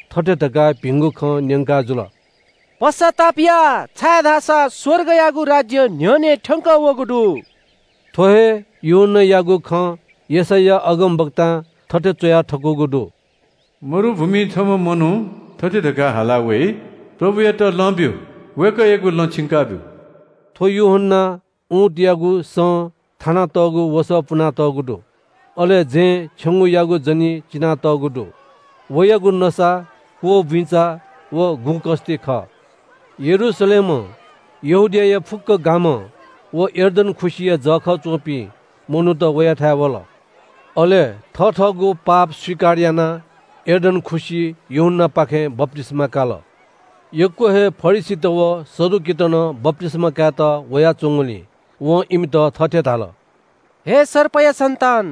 थथे धकाः भिंगु खँ न्‍यंकाजुल – “पश्‍चाताप या, छाय्‌धाःसा स्‍वर्गयागु राज्‍य न्‍ह्यःने थ्‍यंकः वःगु दु।” थ्‍व हे यूहन्‍नायागु खँ यशैया अगमवक्तां थथे च्‍वया थकूगु दु – “मरुभूमिइ छम्‍ह मनू थथे धकाः हालाः वइ – ‘प्रभुयात लँ ब्‍यु, वय्‌कःयागु लँ छिंकाब्‍यु।’” थ्‍व यूहन्‍नां उँटयागु सं थानातःगु वसः पुनातःगु दु। अले जँय् छेंगूयागु जनी चिनातःगु दु। वयागु नसा क्‍वःबुइँचा व गुँ कस्‍ति खः। यरूशलेमं, यहूदियाया फुक्‍क गामं व यर्दन खुसिया जःखः च्‍वंपिं मनूत वयाथाय् वल। अले थथःगु पाप स्‍वीकार यानाः यर्दन खुसिइ यूहन्‍नापाखें बप्‍तिस्‍मा काल। यक्‍व हे फरिसीत व सदुकीत नं बप्‍तिस्‍मा कायेत वयाच्‍वंगुलिं वं इमित थथे धाल – “हे सर्पया सन्‍तान,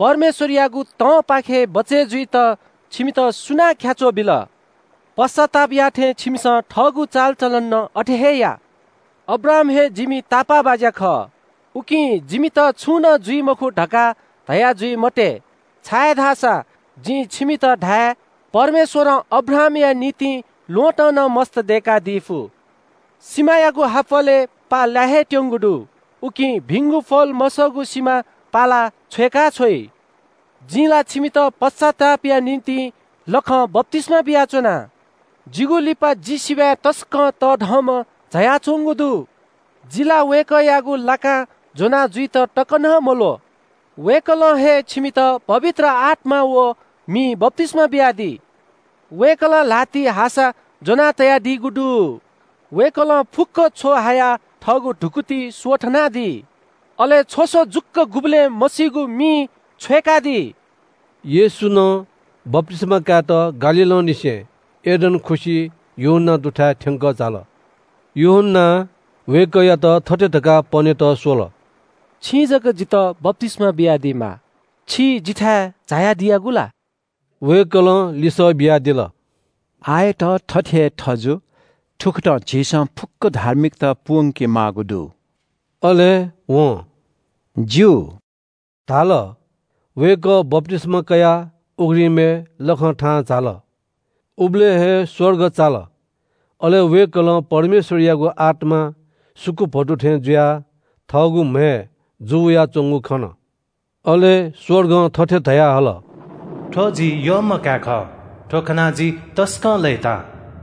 परमेश्‍वरयागु तंपाखें बिस्‍युं वनेत छिमित सुनां ख्‍याच्‍वः बिल? पश्‍चाताप याःथें छिमिसं थःगु चालचलन नं अथे हे या। ‘अब्राहाम हे जिमि बाः खः, उकिं जिमित छुं नं जुइ मखु’ धकाः धयाजुइ मते, छाय्‌धाःसा जिं छिमित धाये – परमेश्‍वरं अब्राहामया निंतिं थुपिं ल्‍वहँतं नं मस्‍त दय्‌कादी फु। सिमायागु हाप्‍वलय् पा लाये हे त्‍यंगु दु। उकिं भिंगु फल मसःगु सिमा पालाः छ्वय्‌काछ्वइ। “जिं ला छिमित पश्‍चातापया निंतिं लखं बप्‍तिस्‍मा बियाच्‍वना। जिगु लिपा जि सिबय् तसकं तःधंम्‍ह झायाच्‍वंगु दु। जि ला वय्‌कःयागु लाकां ज्‍वनाजुइत तक नं मल्‍वः। वय्‌कलं हे छिमित पवित्र आत्‍मां व मिं बप्‍तिस्‍मा बियादी। वय्‌कलं ल्‍हातिइ हासा ज्‍वना तयादीगु दु। वय्‌कलं फुक्‍क छ्व हायाः थःगु धुकुतिइ स्‍वथनादी। अले छ्वस जुक्‍व गुबलें मसीगु मिइ छ्वय्‌कादी।” येशू नं बप्‍तिस्‍मा कायेत गालीलंनिसें यर्दन खुसिइ यूहन्‍ना दुथाय् थ्‍यंकः झाल। यूहन्‍नां वय्‌कःयात थथे धकाः पनेत स्‍वल – “छिं जक जितः बप्‍तिस्‍मा बियादीमाः। छि जिथाय् झायादीयागु ला?” वय्‌कलं लिसः बियादिल – “आःयात थथे हे थजु। थुकथं झीसं फुक्‍क धार्मिकता पूवंके माःगु दु।” अले वं “ज्‍यू” धाल। वय्‌कः बप्‍तिस्‍मा कयाः उघ्रिमय् लखं थाहां झाल। उबलय् हे स्‍वर्ग चाल, अले वय्‌कलं परमेश्‍वरयागु आत्‍मा सुकुभतु थें जुयाः थःगु म्‍हय् जूवयाच्‍वंगु खन। अले स्‍वर्गं थथे धयाहल – “थ्‍व जि यःम्‍ह काय् खः, थ्‍व खनाः जि तसकं लय्‌ताः।”